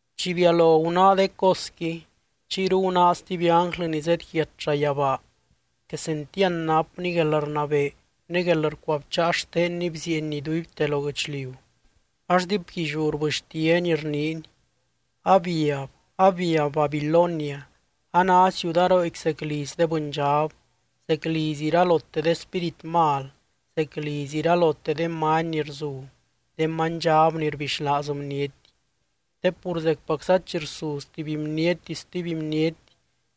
Chi bialo gunáa de cosqui, chiyru gunáa stuby ánglɨ ni zedyiat llayabaa. Quesentiand napny guelrnabee ne guelrcuabcháa xtenny bzieeny iduibte lo guɨchliu, ax diipguilliú rbɨxtiany, rniiny: —Abiab, abiab Babilonia, a ná ciudarooqui zec liz de bɨndxab, zec liz iralote de spírit mal, zec liz iralote de many ni rzu, de manydxab ni rbixlaaz bniety. Te pur zecpacza chi rsuz tuby bniety stuby bniety,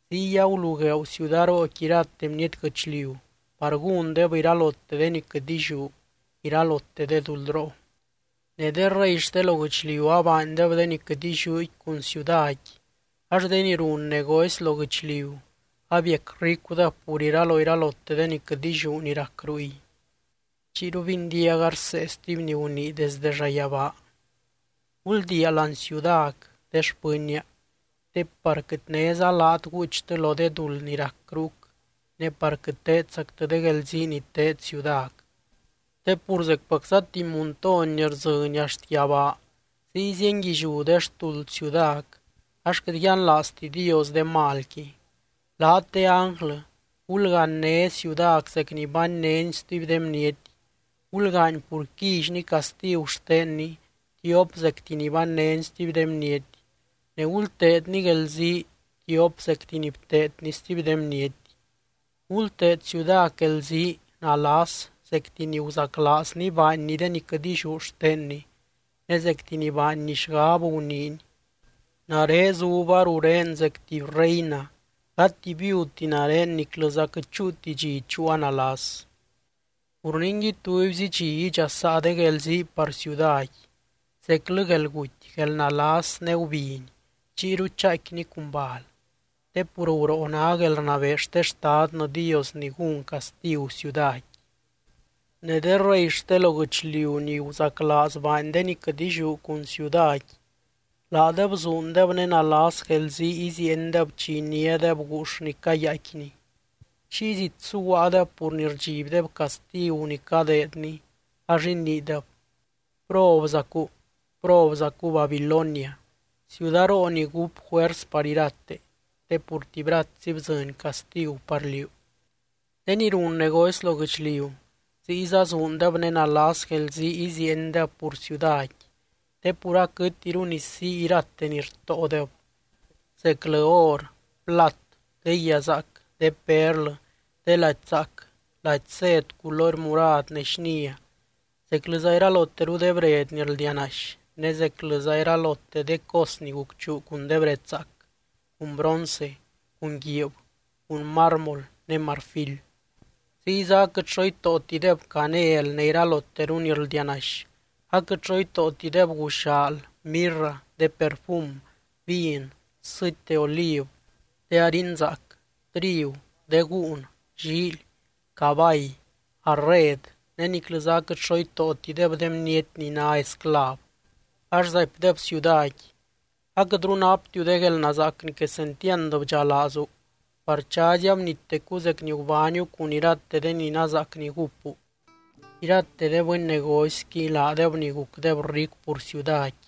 ziy agulugueeu ciudarooqui irate bniety guɨchliu par gúndeb iralote de ni quɨt illiú, iralote de duldroo. Ne de rey xte lo guɨchliu abaandeb de ni quɨt illiúqui cun ciudaqui, ax de ni run negocy lo guɨchliu abiac ricudeb pur iraloiralote de ni quɨt illiú ni rac ruy. Chiyru bindiaga rsee stuby ni gunii desde llayabaa: —Guldiia láani ciudac, de xpɨnnia, te par quɨt néza laat guuchtɨ lo de duld ni rac rúc ne par quɨt teedzactɨ de guelzii ni teed ciudac. Te pur zecpacza tuby muntony ni rdzɨny axt yabaa ziy zienguilliú de xtuld ciudac, ax quɨt yianlaazti Dios de malqui. Laat de ánglɨ, gulganyné ciudac zec ni bannéni stuby de bniety, gulgaany pur quillyni castigu xtenni tiop zecti ni bannéni stuby de bniety ne gulteedni guelzii tiop zecti ni bteedni stuby de bniety. Gulteed ciudac guelzii nalas zecti ni guzaclaazni baanni de ni quɨt illiú xtenni, ne zecti ni baanni xgab guniini: “Nare zuba rurén zec tuby reina, gati viudti nare niclɨza quɨt chúuti dxi chúua nalas.” Pur ningui, tubyzi dxi idxasaa de guelzii par cuidaqui, zeclɨ guelguty, guelnalas ne gubiny, chiyru chaaicquini cun bal. Te pur guroo ná guelrnabee xte Xtadnɨ Dios ni gún castigu ciudaqui. Ne de rey xte lo guɨchliu ni guzaclaaz baany de ni quɨt illiú cun ciudaqui, laadeb zuundeb ne nalas guelzii iziiendeb chi iniádeb guux ni cayaaicquini. Chiy zit suguaadeb pur ni rdxibdeb castigu ni cadeedni, ax iniideb: —¡Probzacu, probzacu Babilonia, ciudaroo ni gúp juers par irate! Te pur tibyratsi bdzɨny castigu par liú. De ni run negocy lo guɨchliu ziyza zuundeb ne nalas guelzii iziiendeb pur ciudaqui, te pur aquɨtiru ni sii irate ni rtóodeb: zeclɨ or, plat, de guia zaac, de perlɨ, de lady zaac, lady sed culory murad ne xnia, zeclɨza iralote de bred ni rldianaxy ne zeclɨza iralote de cos ni gucchuu cun de bred zaac, cun bronce, cun guiib, cun mármol ne marfil. Ziyza aquɨt xo itóotideb canel ne iraloteru ni rldianaxy, aquɨt xo itóotideb guxaal, mirra, de perfum, vin, sɨty de oliv, de harin zaac, trigu, de gúun, llíily, cabay, arred ne niclɨza aquɨt xo itóotideb de bniety ni ná esclav. Ax zaipdeb ciudaqui: —¡Aquɨtru naptiu de guelnazaac ni quesentiand bdxalaazu, par chazy abnittecu zec ni gubániu cun irate de ni nazaac ni gúppu! Irate de bɨny negocyqui, laadeb ni gucdeb ricu pur ciudaqui,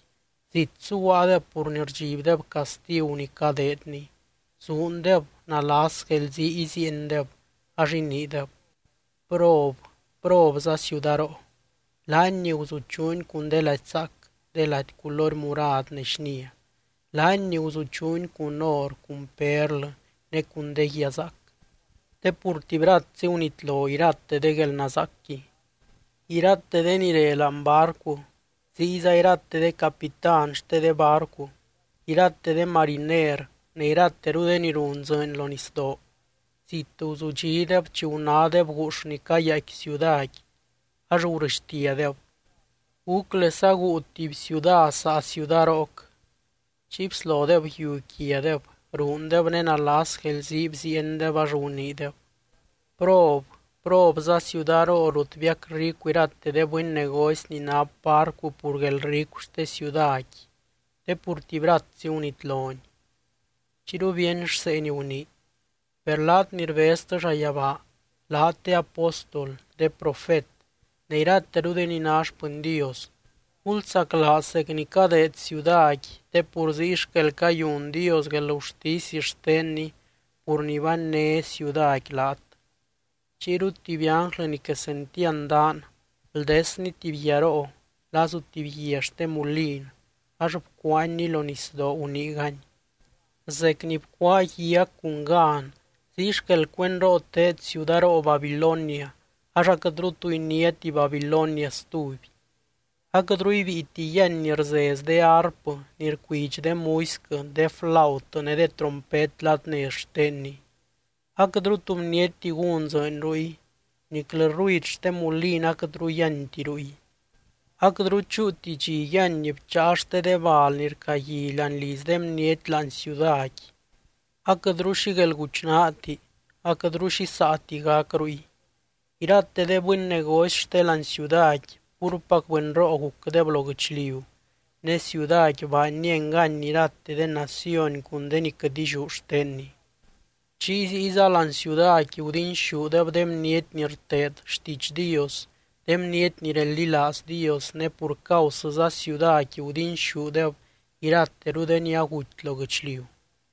zit suguaadeb pur ni rdxibdeb castigu ni cadeedni. Zuundeb, nalas guelzii iziiendeb ax iniideb: —¡Prob, probza ciudaroo! Laany ni guzuchuuni cun de lady zaac, de lady culory murad ne xnia, laany ni guzuchuuni cun or, cun perlɨ ne cun de guia zaac te pur, ¡tibyratsi gunitlo irate de guelnazaacqui! Irate de ni re láani barcu, ziyza irate de capitán xte de barcu, irate de mariner ne irateru de ni run dzɨɨny lo nisdoo, zit guzudxideb chi gunádeb guux ni cayaaicqui ciudaqui, ax gurɨxtiadeb: —¿Gúclesa guu tuby ciuda saa ciudarooc? Chiy bslodeb yiu quiadeb, ruundeb ne nalas guelzii bziiendeb ax guniideb: —¡Prob! Probza ciudaroo rut biac ricu irate de bɨny negocy ni nap barcu pur guelricu xte ciudaqui te pur, ¡tibyratsi gunitloni! Chiyru bíeny rsee ni gunii: —Per laat ni rbeztɨ llayabaa, laat de apóstol, de profet ne irateru de ni ná xpɨny Dios, gulsaclaaz zec ni cadeed ciudaqui te pur ziy xquel cayun Dios guelgurtisy xtenni pur ni banné ciudaqui laat. Chiyru tuby ánglɨ ni quesentiand daan, bldesny tuby guiaroo, lazu tuby guia xte mulin ax bcuaanyni lo nisdoo, guniigany: —Zec ni bcuáa guiac cun gan, ziy xquel cuendroo teed ciudaroo Babilonia, ax aquɨtru tu iniáti Babilonia stuby. Aquɨtru ibíiti yíany ni rzez de arpɨ, ni rcuidx de muisquɨ, de flaut ne de trompet ladnez xtenni. Aquɨtru tu bnietti gún dzɨɨny ruy, niclɨ ruid xte mulin aquɨtru yíanti ruy. Aquɨtru chúuti dxi yíany bcháa xte de bal ni rcagui láani liz de bniety láani ciudaqui, aquɨtru xi guelguchnaati, aquɨtru xi saati gac ruy. Irate de bɨny negocy xte láani ciudaqui púrpac bɨnroo gucdeb lo guɨchliu, ne ciudaqui baanni engany irate de naciony cun de ni quɨt illiú xtenni. Chiy ziyza láani ciudaqui gudinxúdeb de bniety ni rteed xtiidx Dios, de bniety ni reldilaaz Dios, ne pur causɨza ciudaqui gudinxúdeb irateru de ni aguty lo guɨchliu.